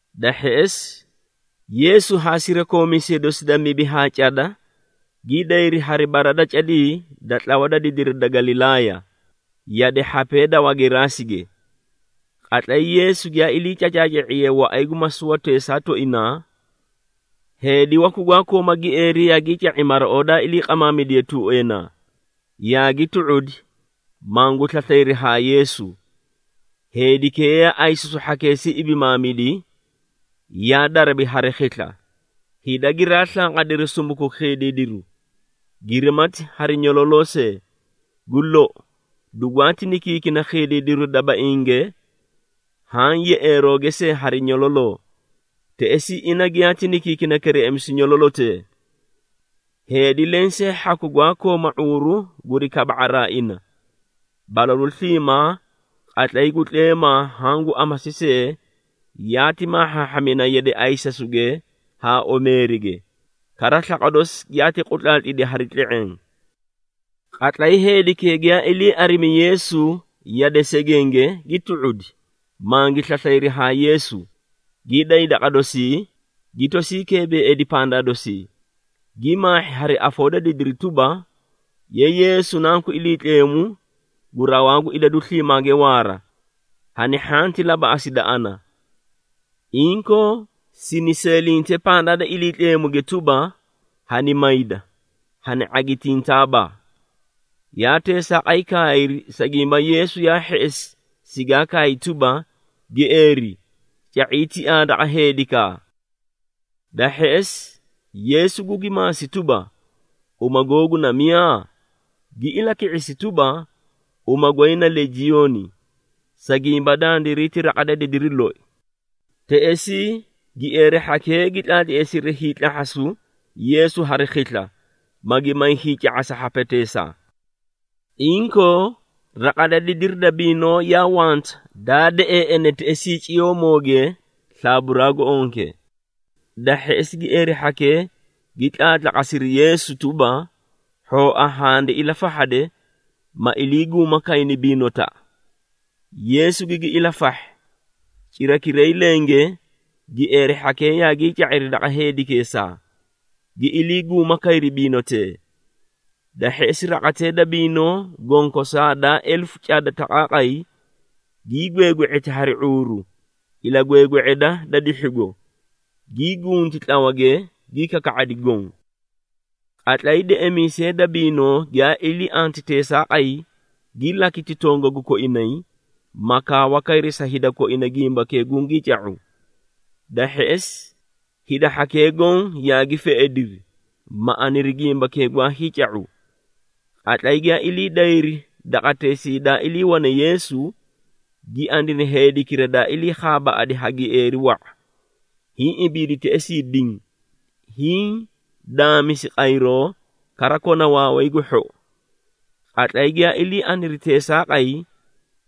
Da hheꞌesi, Yeesu haa sirakoomiisee dosi da mibi haa cada gi dayri hari bara da cadii da tlawa da didiri da Galilaaya, yade hhapee da Wageraasige. Qatlay Yeesu giyaa ilii cacaaca⁄iye waꞌay gu masuwateesaa tooinaa, heedi waku gwaa kooma gieeri yaagii ca⁄i maraoo daa ilii qamaamidiye tuueenaa, yaagi tu⁄udi, mangu slaslayri haa Yeesu. Heedikee yaa ayisasu hhakeesii ibimaamidi, yaa darabi hari khisla, hida giraa slanqadiri sumuku khiidiidiru, girimati hari nyololoo see. Gu lou, dugwaati nikiikina khiidiidiru dabainge haã yeꞌeerooge see hari nyololoo, teꞌesii ina giyaati nikiikina kereꞌemisu nyololotee. Heedi lensee hhaku gwaa kooma ⁄uuru guri kaba⁄araa ina. Balalu sliimaa, qatlay gu tleemaa haã gu amasi see yaati maahhaahhamina yade ayisasuge haa omeerige, kara slaqwa dosi giyaati qutlaatlidi hari tle⁄eẽ. Qatlay heedikee giyaa ilii arimi Yeesu yade segenge, gi tu⁄udi, mangi slaslayri haa Yeesu, gi day daqa dosii, gi tosii keebeeidi pandaa dosii, gi maahhi hari afoo da didiri tuba, “Ye Yeesu, Nanku Iliitleemu gu Rawaa gu Idadu Sliimaage Waara, hani hhanti labaꞌasida ana! Inkoo sini seelinte pandaa da Iliitleemuge tuba, hani mayda, hani ⁄agitintaaba!” Yaa teesaaqay kaayri, sa gimba Yeesu yaa hheꞌesi sigaa kaay tuba, “Gieeri, ca⁄ii tiaa daqa heedikaa!” Da hheꞌesi, Yeesu gugi maasi tuba, “Uma googu na miyaa?” Gi ilaki⁄isi tuba, “Uma goy na ‘Legioni,’ sa gimba dandiray ti raqa da didiri loi.” Teꞌesii gieeri hhakee gi tlaatleesiri hiitlahhasu Yeesu hari khisla, magi may hiica⁄asa hhapeteesaa. Inkoo raqa da didiri da biinoo yaa wanta, daa deꞌeeꞌene teꞌesii ciyoomooge slaaburaa gu onke. Da hheꞌesi gieeri hhakee gi tlaatlaqasiri Yeesu tuba, “Hhooa handi ilafahhade, ma iliiguuma kayni biinotaꞌa.” Yeesu gigi ilafahhi. Cirakiray lenge gieeri hhakee yaagii ca⁄iri daqa heedikeesaa, gi iliiguuma kayri biinotee. Da hheꞌesi raqatee da biinoo, gonkosaa daa elefu cada taqaaqay, gii gweegwe⁄eti hari ⁄uuru ilagweegwe⁄eda da dihhigo, gii gunti tlawage, gi kaka⁄adi goõ. Qatlay deꞌemiisee da biinoo giyaa ilii anti teesaaqay, gi lakiti tongagu koinay, ma kaawa kayri sa hida koina gimbakee gungii ca⁄u. Da hheꞌesi, hida hhakee goõ yaagi feꞌediri, ma aniri gimbakee gwaa hiica⁄u. Qatlay giyaa ilii dayri daqateesii daa iliiwane Yeesu, gi aniri heedikira daa ilii khaabaaꞌadi ha gieeri wa⁄a, hiĩ ibiidi teꞌesii diĩ, hiĩ daamisi qayroo, kara kona waaway gu hhou. Qatlay giyaa ilii aniri teesaaqay,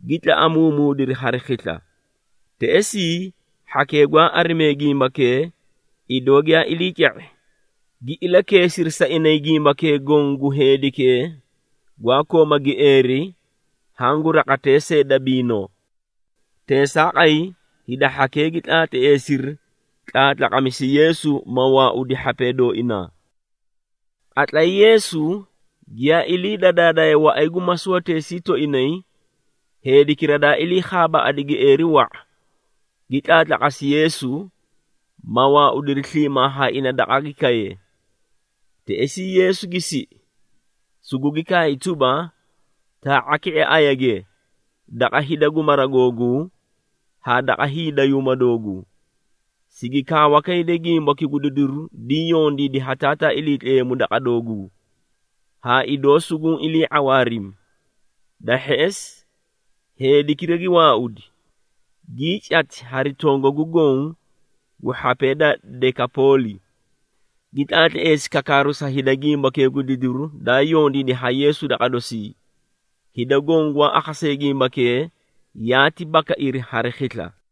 gi tlaꞌamuumuudiri hari khisla. Teꞌesii, hhakee gwaa arimee gimbakee, idoo giyaa ilii ca⁄i, gi ilakeesiri sa inay gimbakee goõ gu heedikee gwaa kooma gieeri haã gu raqatee see da biinoo. Teesaaqay hida hhakee gi tlaatleesiri tlaatlaqamisu Yeesu ma waaudi hhapee dooinaa! Qatlay Yeesu giyaa ilii dadaadaye waꞌay gu masuwateesii tooinay, heedikira daa ilii khaabaaꞌadi gieeri wa⁄a, gi tlaatlaqasi Yeesu, ma waaudiri sliimaa haa ina daqa gi kaye. Teꞌesii Yeesu gi siꞌi, sugugi kaay tuba, “Taa⁄a ki⁄e ayage, daqa hida gu mara googuu haa daqa hiidayuuma dooguu, sigi kaawa kayde gimbaki gu didiru diĩ yondiidi ha Taataa Iliitleemu daqa dooguu, haa idoo suguũ ilii ⁄awaarimi.” Da hheꞌesi, heedikira gi waaudi, gii cati hari tongagu goõ gu hhapee da Dekapooli, gi tlaatleesi kakaaru sa hida gimbakee gu didiru daa yondiidi ha Yeesu daqa dosii. Hida goõ gwaa akhasee gimbakee, yaati bakairi hari khisla.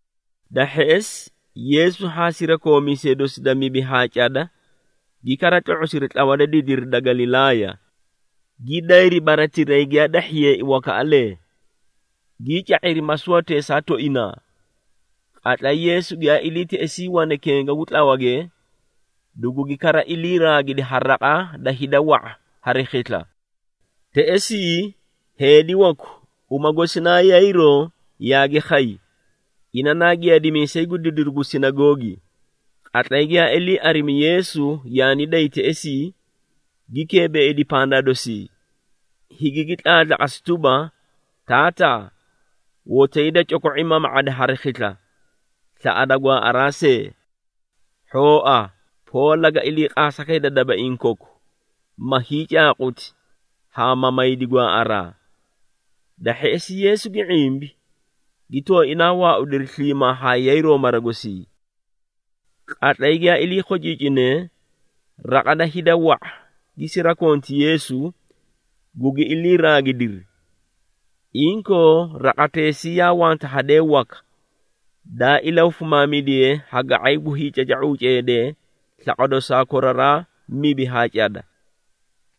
Da hheꞌesi Yeesu haa sirakoomiisee dosi da mibi haa cada gi kara tlo⁄osiri tlawa da didiri da Galilaaya, gi dayri baratirayi giyaa dahhiyeei wakaꞌalee, gii ca⁄iri masuwateesaa tooinaa. Qatlay Yeesu giyaa ilii teꞌesii wane kenga gu tlawage, dugugi kara iliiraagidi ha raqa da hida wa⁄a hari khisla. Teꞌesii heedi waku, uma gosi naa Yayiroo, yaagi khay. Ina naa giyaadimiisay gu didiru gu sinagoogi. Qatlay giyaa ilii arimi Yeesu yaani day teꞌesii, gi keebeeidi pandaa dosii, higigi tlaatlaqasi tuba, “Taataa, hotoyi da coko⁄i mama⁄ada hari khisla, slaꞌada gwaaꞌaraa see. Hhooa poo, laga iliiqaasa kayda dabaiĩ koku, ma hiicaaquti haa ma maydi gwaaꞌaraa.” Da hheꞌesi Yeesu gi ⁄imbi, gi tooinaa waaudiri sliimaa haa Yayiroo mara gosii. Qatlay giyaa ilii khociicinee, raqa da hida wa⁄a gi sirakonti Yeesu, gugi iliiraagidiri. Inkoo raqateꞌesii yaa wanta hadee waka, daa ilahufimaamidiye ha ga⁄ay gu hiicaca⁄uu ceedee slaqwa dosaa koraraa mibi haa cada.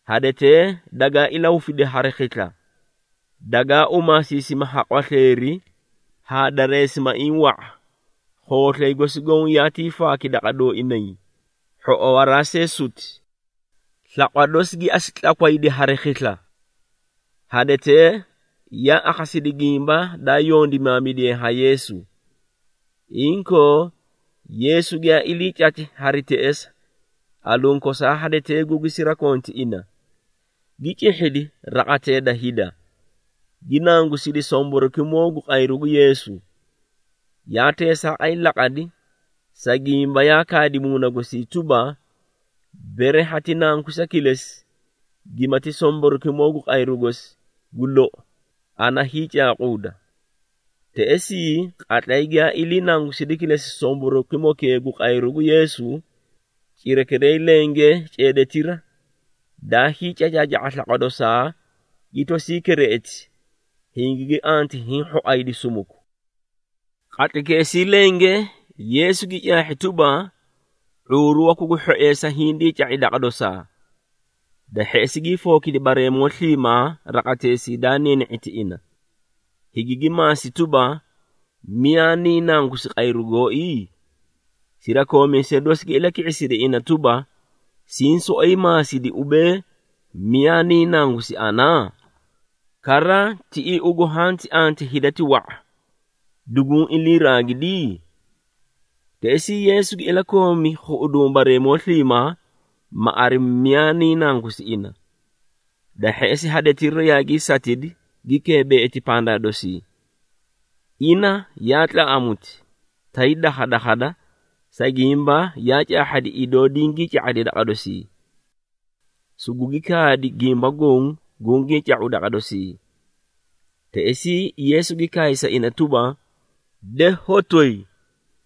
Hadetee dagaa ilahufidi hari khisla, dagaa umaasiisimi ha qwasleeri haa dareesimaiĩ wa⁄a, khooslay gosi goõ yaatii faaki daqa dooinay, hhoꞌowaraa see suti. Slaqwa dosi gi asu tlakwaydi hari khisla. Hadetee yaa akhasidi gimba daa yondimaamidiye ha Yeesu. Inkoo Yeesu giyaa ilii cati hari teꞌesa, aluũ kosaa hadetee gugi sirakonti ina, gi cihhidi raqatee da hida, gi nangusidi somborokimoo gu qayru gu Yeesu. Yaa teesaaqay laqadi, sa gimba yaa kaadi muuna gosii tuba, “Bere hati nangusa kilesi, gimati somborokimoo gu qayru gosi, gu lou, ana hiicaaquuda.” Teꞌesii, qatlay giyaa ilii nangusidi kilesi somborokimokee gu qayru gu Yeesu, cirakiray lenge ceedetira, daa hiicacaaca⁄a slaqwa dosaa, gi tosii kereꞌeti, hingigi anti hiĩ hhoaydi sumuku. Qatlaykeesii lenge Yeesu gi caahhi tuba, ⁄uuru waku gu hhoeesa hindii ca⁄i daqa dosaa. Da hheꞌesi gii fookidi bareemoo sliimaa raqateesii daa niini⁄iti ina, higigi maasi tuba, “Miyaa niĩ nangusi qayru gooi?” Sirakoomiisee dosi gi ilaki⁄isiri ina tuba, “Siĩ soꞌoyi maasidi, ubee, ‘Miyaa niĩ nangusi ana?’ Kara tiꞌii ugu hanti anti hida ti wa⁄a, duguũ iliiraagidi?” Teꞌesii Yeesu gi ilakoomi khuꞌuduũ bareemoo sliimaa, ma arimi miyaa niĩ nangusi ina. Da hheꞌesi, hadetira yaagii satidi, gi keebeeiti pandaa dosii. Ina yaa tlaꞌamuti, tay dakhadakhada, sa gimba yaa caahhadi idoo dingii ca⁄adi daqa dosii. Sugugi kaadi gimba goõ gungii ca⁄u daqa dosii. Teꞌesii Yeesu gi kaay sa ina tuba, “De hotoyi,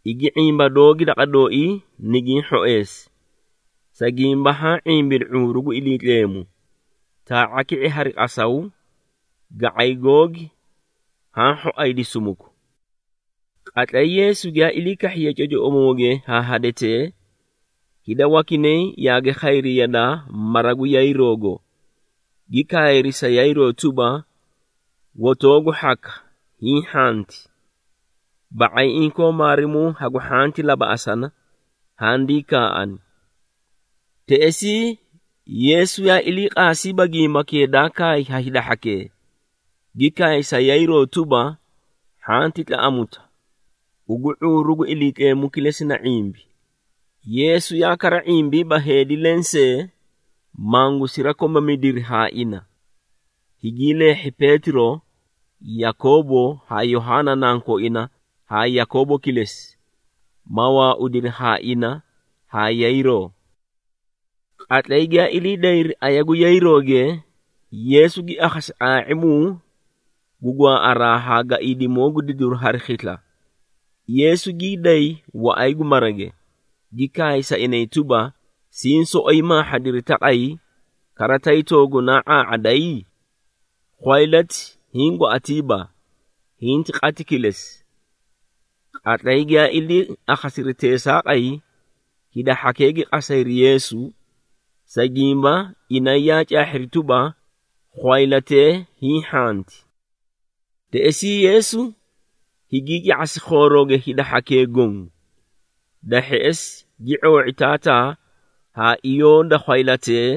igi ⁄imba doogi daqa dooii nigiĩ hhoeesi, sa gimba haã ⁄imbidi ⁄uuru gu Iliitleemu. Taa⁄a ki⁄e hari qasaw, ga⁄ay googi haã hhoaydi sumuku.” Qatlay Yeesu giyaa ilii kahhiye cocoꞌomooge haa hadetee, hida wakinay yaagi khayri yadaa mara gu Yayiroogo, gi kaayri sa Yayiroo tuba, “Hotoogu hhaka, hiĩ hhanti! Ba⁄ay inkoo maarimuu hagu hhanti labaꞌasana, handii kaaꞌani.” Teꞌesii Yeesu yaa iliiqaasiiba gimbakee daa kaay haa hida hhakee, gi kaay sa Yayiroo tuba, “Hhanti tlaꞌamuta, ugu ⁄uuru gu Iliitleemu kilesi na ⁄imbi.” Yeesu yaa kara ⁄imbiiba heedi lensee, mangu sirakomamidiri haa ina. Higii leehhi Peetiro, Yakoobo haa Yohaana nankooina haa Yakoobo kilesi, ma waaudiri haa ina haa Yayiroo. Qatlay giyaa ilii dayri aya gu Yayirooge, Yeesu gi akhasi ⁄aa⁄imuu gu gwaaꞌaraa haa gaiidimoo gu didiru hari khisla. Yeesu gii day waꞌay gu marage, gi kaay sa inay tuba, “Siĩ soꞌoyi maahhadiri taqay, kara tay toogunaa ⁄aa⁄aday? Khwaylati hiĩ gwaꞌatiiba, hinti qati kilesi!” Qatlay giyaa ilii akhasiri teesaaqay, hida hhakee gi qasayri Yeesu, sa gimba inay yaa caahhiri tuba, khwaylatee hiĩ hhanti. Teꞌesii Yeesu higii ca⁄asi khoorooge hida hhakee goõ. Da hheꞌesi, gi ⁄oo⁄i taataa haa iyoo da khwaylatee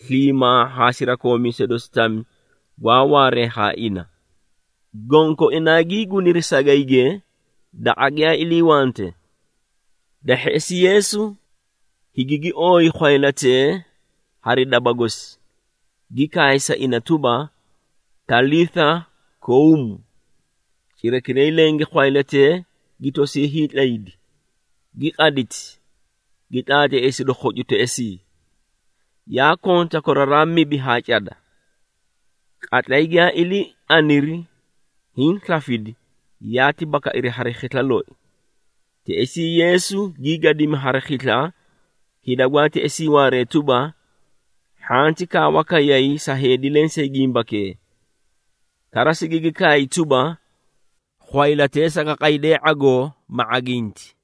sliimaa haa sirakoomiisee dosi tami gwaa waaree haa ina, gonkoinaa gii guniri sagayge, daqa giyaa iliiwante. Da hheꞌesi, Yeesu higigi ooyi khwaylatee hari daba gosi, gi kaay sa ina tuba, “Talitha koum!” Cirakiray lenge khwaylatee gi tosii hiitlaydi, gi qaditi, gi tlaatleesidi khocu teꞌesii. (Yaa konta koraraa mibi haa cada). Qatlay giyaa ilii aniri hiĩ slafidi, yaati bakairi hari khisla loi. Teꞌesii Yeesu gii gadimi hari khisla hida gwaa teꞌesii waaree tuba, hhanti kaawa kayay sa heedi lensee gimbakee. Kara sigigi kaay tuba, “Khwaylatee saga qaydee ⁄agoo, ma ⁄aginti.”